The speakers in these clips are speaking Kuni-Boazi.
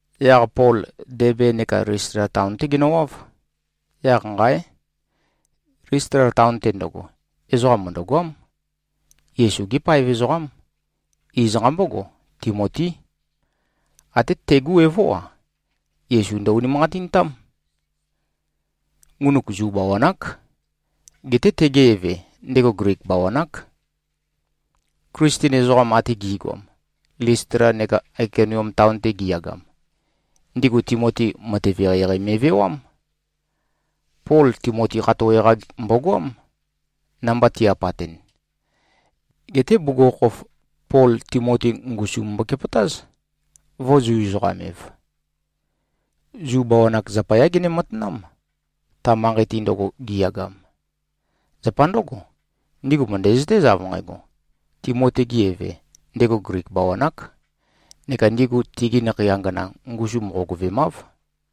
Yaq Pol Debe neka Listla taon-té genøwáv. Yaq nqáe! Listla taon-te ndøgo, ezoqa mø̀ndøgoám. Yesu-gé paev ezoqám. Iz nqambógo, Timotí. Até tegu evó-a, Yesu ndø-unimanqatintám. Ngunuk Zu bawan-ák. Geté tege eve, ndego Glik bawan-ák. Klisten ezoqam ate gi꞉goam, Listla neka Aikonium taon-te giyagam, ndigu Timoti matev eqeieqei me꞉vewám. Pol Timoti khatowe-qa mbogoám, namba ti-apatɨn. Geté bugukhokhof, Pol Timoti ngusum mbokepøtáz, ⌞vø̄-Zu-ezoqam-ev.⌟ Zu bawan-ak zapayá gene-matanám, ta manqei-te ndøgo giyagam. Zapa ndǿgo, ndigu mø̀ndæzøtéz av nqægo, Timoti-ge eve, ndego Glik bawan-ák, ⌞neka ndigu tigi nakhei angana ngusum qogøvemāv.⌟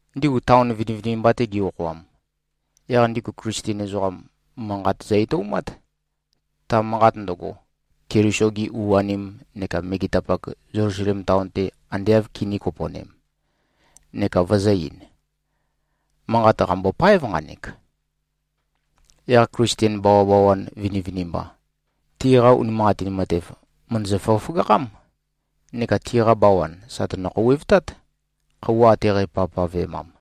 Ndigu taon vinivinimba-te gi-okhoam, yaq ndigu Klisten ezoqam, manqat zø-etoumát, ta manqat ndøgo, Keliso-gi u-anim neka megetapak Zelusalem taon-te ande āv kinī-kopo꞉nem, neka vøzø̄-ein, “Manqat qàmbopáev nqanek.” Yaq Klisten bawabawan vinivinimba, tiqa unimanqatin matev mø̀ndøzø-føgøføgakhám, neka tiqa bawan sà tønø-khouwevtát, khøuwa ate qæpavpavemam.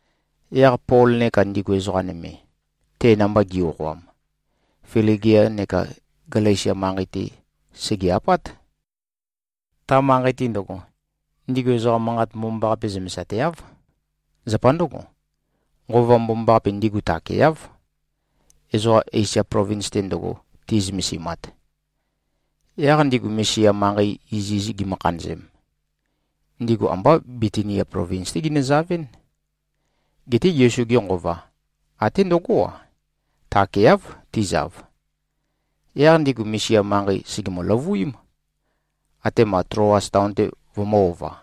Yaq Pol neka ndigu ezoqa nøme, te namba gi꞉-okhoam, Fligia neka Galesia manqei-te sège-apát. Ta manqei-te ndøgo, ndigu ezoqa Manqat Mbomambaqape zømesateáv. Zapa ndǿgo, Nqova Mbomambaqape ndigu takeáv, ezoqa Esia plovins-te ndøgo, ti꞉zømesimat. Yaq ndigu Misia manqei iziz gimø-khanøzem, ndigu ambá Bitinia plovins-té ginøzavɨ́n. Geté Yesu-ge Nqova, até ndøgó-a, takeáv, tizav. Yaq ndigu Misia manqei sègemø-løvuím, atema Tloas taon-te vømø̄-ova.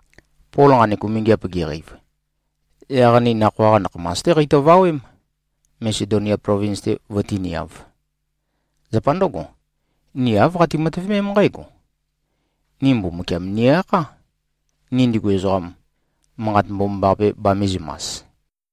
Pol nqanek umingiap geqeiv, yaq ni nakhoa-qa nakhamas-té qeitøvawém, Masedonia plovins-te vøtíniāv. Zapa ndǿgo, ni āv qati-matøvemém nqǽgo: Ni Mbumbukiam ni-akhá, ni ndigu ezoqam, Manqat Mbomambaqape bamīzømas.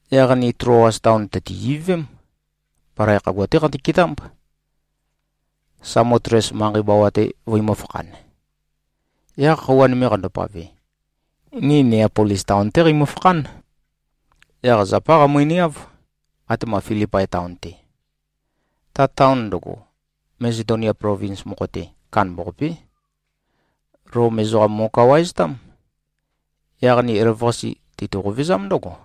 Yaq ni Tloas taon tø̀ti-ivøvém. Palai khagua-té qeitø-ketámb, Samotles manqei bawa-te vøimø̄-fakhan. Yaq khøuwa nøme qandopave, ni Neapolis taon-té qeimø-fakhán. Yaq zapá qeimøniáv, atema Filipai taon-te. Ta taon ndøgo, Masedonia plovins mokho-te, kandambaqapé. Lom ezoqam mo꞉kawaeztám. Yaq ni elavøqase, teitø-qovezám ndǿgo.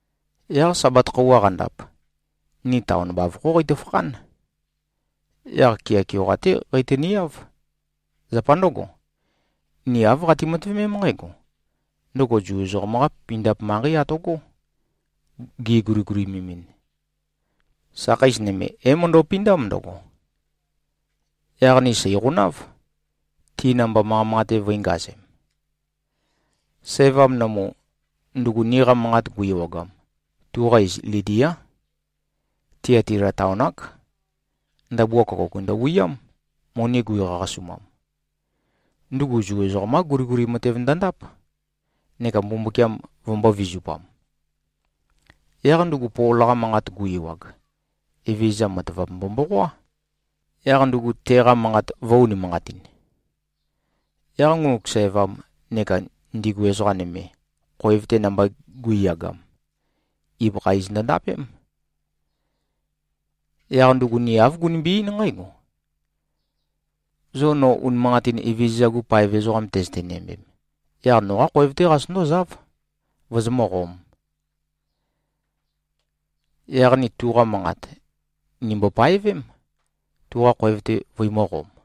Yaq Sabat khøuwa qandap, ni taon bavokhó qeitø-fakhán. Yaq kea keoqa-té qeitøniáv. Zapa ndǿgo, ni āv qati-matøvemém nqǽgo: Ndøgo Zu ezoqam-qá pindap manqei atøgó, giguligulimemin. Sakheis nøme, é-møndøpindám ndøgo. Yaq ni sèiqonáv, ti namba manqa manqate vø̄ingazem. Sævam nømu, ndugu niqa manqat gu-ewagam, tuqa iz Lidiá. Tiatila taon-ák. Ndabua køkouk ndøwiám, moni guiqaqasumam. Ndugu Zu ezoqam-qá guliguli matev ndøndáp, neka Mbumbukiam vømbō-vizupam. Yaq ndugu Pol-qa manqat gu-ewag, Evezøza matavap mbomboqoá, yaq ndugu teqa manqat vø̄-unimanqatin. Yaq ngunuk sævam neka ndigu ezoqa nøme, khoev-te namba gu꞉yagam, ibøkha iz ndøndapém. Yaq ndugu ni āv gunimbi-eín nqǽgo, “Zo no unimanqatin Evezøza-gu paev ezoqam tøzøte-næmbem, yaq noqá khoev-té qazøtøndózáv, vozomǿqōm.” Yaq ni tuqa manqat, nìmbo-paevém, tuqa khoev-te vøimø̄qom.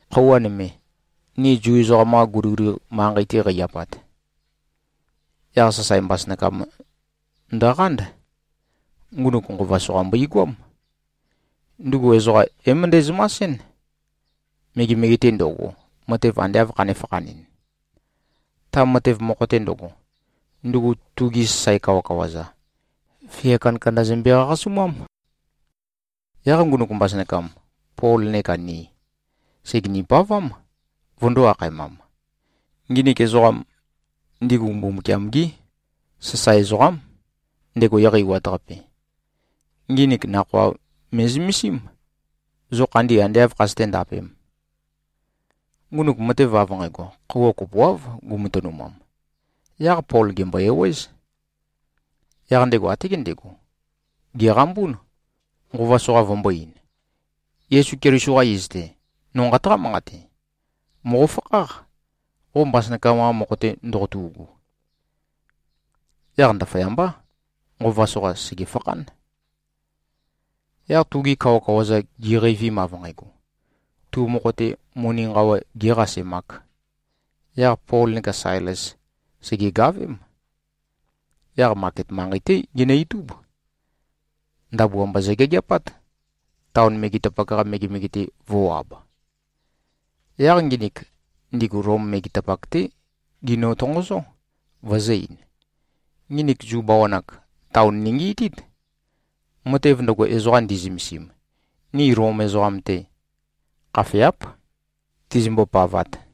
Khøuwa nøme, ni Zu ezoqam-qa guliguli manqei-te qei-apat, yaq sasae mbasønakam ndøqánd. Ngunuk nqova soqa mbøigoám. Ndugu ezoqa é-møndæ-zømasɨ́n, megemege-te ndo꞉go, matev ande āv khanē-fakhanɨn. Ta matev mokho-te ndøgo, ndugu tugi sasae kawakawa-za, fia kandakanda zømbe-qaqasumám. Yaq ngunuk mbasønakam, Pol neka ni, sègeni-pavám, vøndō-akhaemam, “Nginik ezoqam, ndigu Mbumbukiam-gí sasae ezoqám, ndego Eqeiwat-Qape. Nginik nakhoa me꞉zømesím, zo khandi ande āv khazøté-ndapēm.” Ngunuk matev av nqægo, khøuwa kopoáv gumatønumam. Yaq Pol gèmbo-ewéz. Yaq ndego até gendego, gèqambún, nqova soqa vømbō-ein, “Yesu Keliso-qa iz-te, no nqataqá-manqate: Mòqofakháq, qo mbasønakam-qa mokho-te ndoqotu꞉gu.” Yaq ndaføyambá, nqova soqa sègefakhán. Yaq tugi kawakawa-za giqeivim, av nqægo, tu mokho-te, moni nqawa gēqasemāk, yaq Pol neka Sailes sègegavém. Yaq maket manqei-té ginø-itub. Ndabua mba zøgeageapát, taon megetapak-qa megemege-te vō꞉-ab. Yaq nginik, ndigu Lom megetapak-té ginø-tonqozó, vøzø̄-ein, “Nginik Zu bawan-ak, taon ningiitít! Matev ndøgo, ezoqa ndi꞉zømesim, ni Lom ezoqam-te khafeáp, tizimbo-pavat.”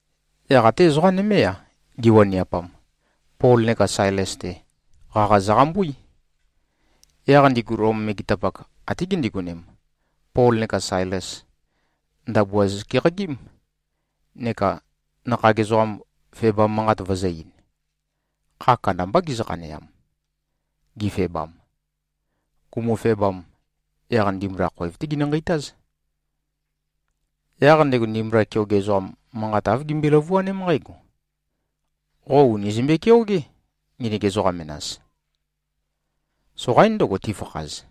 Yaq até ezoqa nømé-a, giwaniapam, Pol neka Sailes-te, qaqa zøqambuí. Yaq ndigu Lom megetapak, até gindigonem, Pol neka Sailes, ndabua zøkeqagím, neka nakhag ezoqam febam manqat vøzø̄-ein. Kha kandambá gizø-khaneam, gifebam. Gumufebam, yaq ndimbula khoev-té ginø-nqeitáz. Yaq ndego ndimbula keoge ezoqam, manqa āv gimbøe-løvuaném nqǽgo, “Qo ùni zømbe-keogé, nginik ezoqa menas. Soqaín ndøgo, tifakhaz.”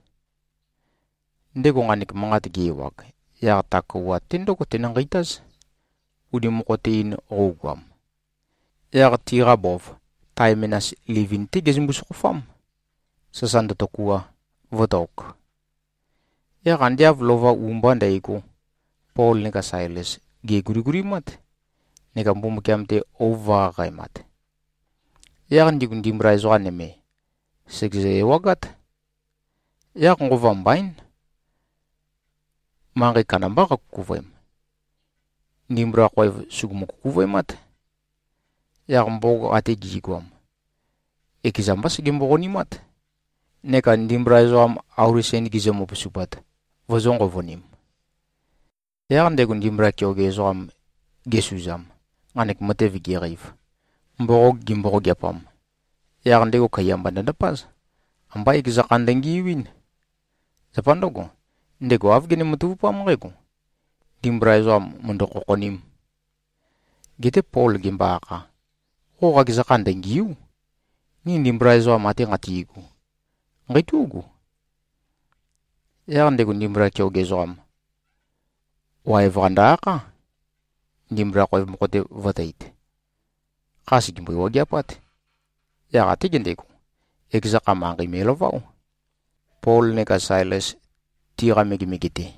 Ndego nqanek manqat ge-ewag, yaq ta kouwat-te ndǿgo tenø-nqeitáz, uni mokho-te-in qøugoam. Yaq tiqa bov, tae menas livin-té gezømbu-sokhofám, sasa ndøtøkua, vø̄tok. Yaq ande av lova u-mba ndægo, Pol neka Sailes, gèguligulimát neka Mbumbukiam-te ouv vø̄-qaqaemat. Yaq ndigu ndimbula ezoqa nøme, sègezø-ewagát. Yaq nqova mbaín, manqei kandambá qakukuvøem. Ndimbula khoev sùgumu-kukuvøemát. Yaq mboqog ate gi꞉goam, ekeza mbá segembo-qonimát, neka ndimbula ezoqam auli sen gizø-møpusupat, vøzø̄-nqovonim. Yaq ndego ndimbula keoge ezoqam gesuzam, nqanek matev geqeiv, mboqog gimboqogeapam, yaq ndego kaiya mba ndøndapáz. Ambá ekeza kha ndøngiuín. Zapa ndǿgo, ndego āv gene-matavupám nqǽgo: Ndimbula ezoqam mø̀ndø-khokhonīm. Geté Pol gembo-akha, “Qo qakeza kha ndøngìu᷄. Ni ndimbula ezoqam ate nqati꞉gu, nqeitú꞉gu.” Yaq ndego ndimbula keoge ezoqam, waev-qa ndø-akhá, ndimbula khoev mokho-te vø̄teit. Kha sègembøɨ-wageapát. Yaq até gendego, ekeza kha manqei me꞉laváo, Pol neka Sailes, tiqa megemege-te.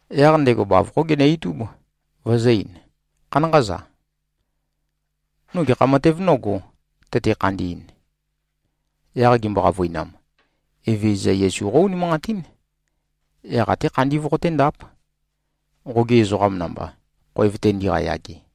Yaq ndego bavokhó ginø-itúb, vøzø̄-ein, “Khanánqa-za. No gekha matev nógō, tøte-khandi꞉n?” Yaq gimbo-qavøinam, “Evezøza Yesu qó-unimanqatín. Yaq atē khandī voqotēndāp, qogi ezoqam namba, khoev-te ndiqayage.”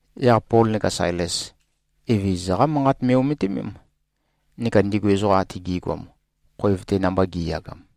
Yaq Pol neka Sailes, Evezøza-qá Manqat me꞉-ometimém, neka ndigu ezoqa ate gi꞉goam, khoev-te namba gi꞉yagam.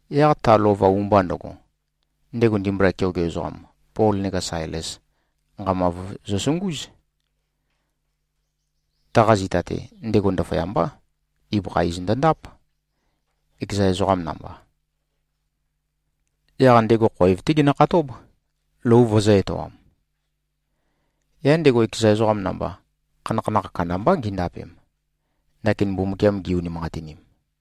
Yaq ta lova u-mba ndøgo, ndego ndimbula keoge ezoqam, Pol neka Sailes nqamav zøsungúz. Taqa zita-te, ndego ndaføyambá, ibøkha iz ndøndáp, ekeza ezoqa namba. Yaq ndego khoev-té genøkhatób, lou vøzø̄-etoam. Yaq ndego ekeza ezoqam namba, khanakhanakh kandambá gindapem, ndakin Mbumbukiam gi-unimanqatinim.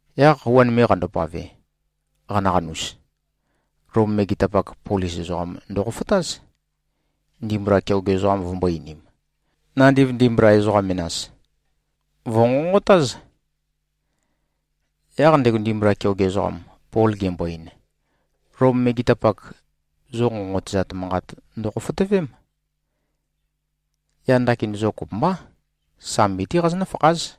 Yaq khøuwa nøme qandopave, qanaqanus, Lom megetapak, polis ezoqam ndøkhofotáz, ndimbula keoge ezoqam vømbō-einim, “Nandiv ndimbula ezoqa menas, vø̀nqonqotáz!” Yaq ndego ndimbula keoge ezoqam, Pol gembo-ein, “Lom megetapak, zo nqonqotøzat manqat ndokhofotøvém. Yaq ndakin zo kopømbá, sambi-té qazonǿ-fakház.”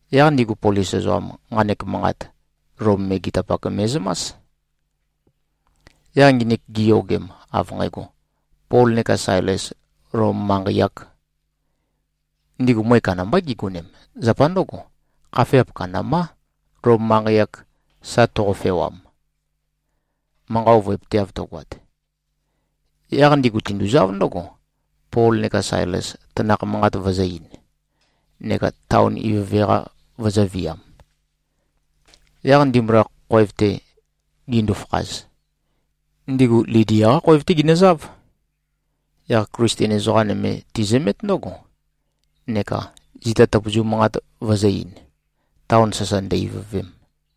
Yaq ndigu polis ezoqam, nqanek manqat, Lom megetapak me꞉zømás. Yaq nginik giyogem, av nqægo, Pol neka Sailes Lom manqei-āk, ndigu møe kandambá gigonem. ⌞Zapa ndǿgo, khafeap kandambá, Lom manqei-ak sa toqofewam, manqa ovøepøteav tøgoat.⌟ Yaq ndigu tinduzáv ndǿgo, Pol neka Sailes tanakh manqat vøzø̄-ein, neka taon ivøve-qa vøzø̄viam. Yaq ndimbula khoev-te gindu-fakhaz, ndigu Lidia-qá khoev-té ginøzáv. Yaq Klisten ezoqa nøme tizømét ndǿgo, neka zita tøpøzu manqat vøzø̄-ein, taon sasa ndø-ivøvem.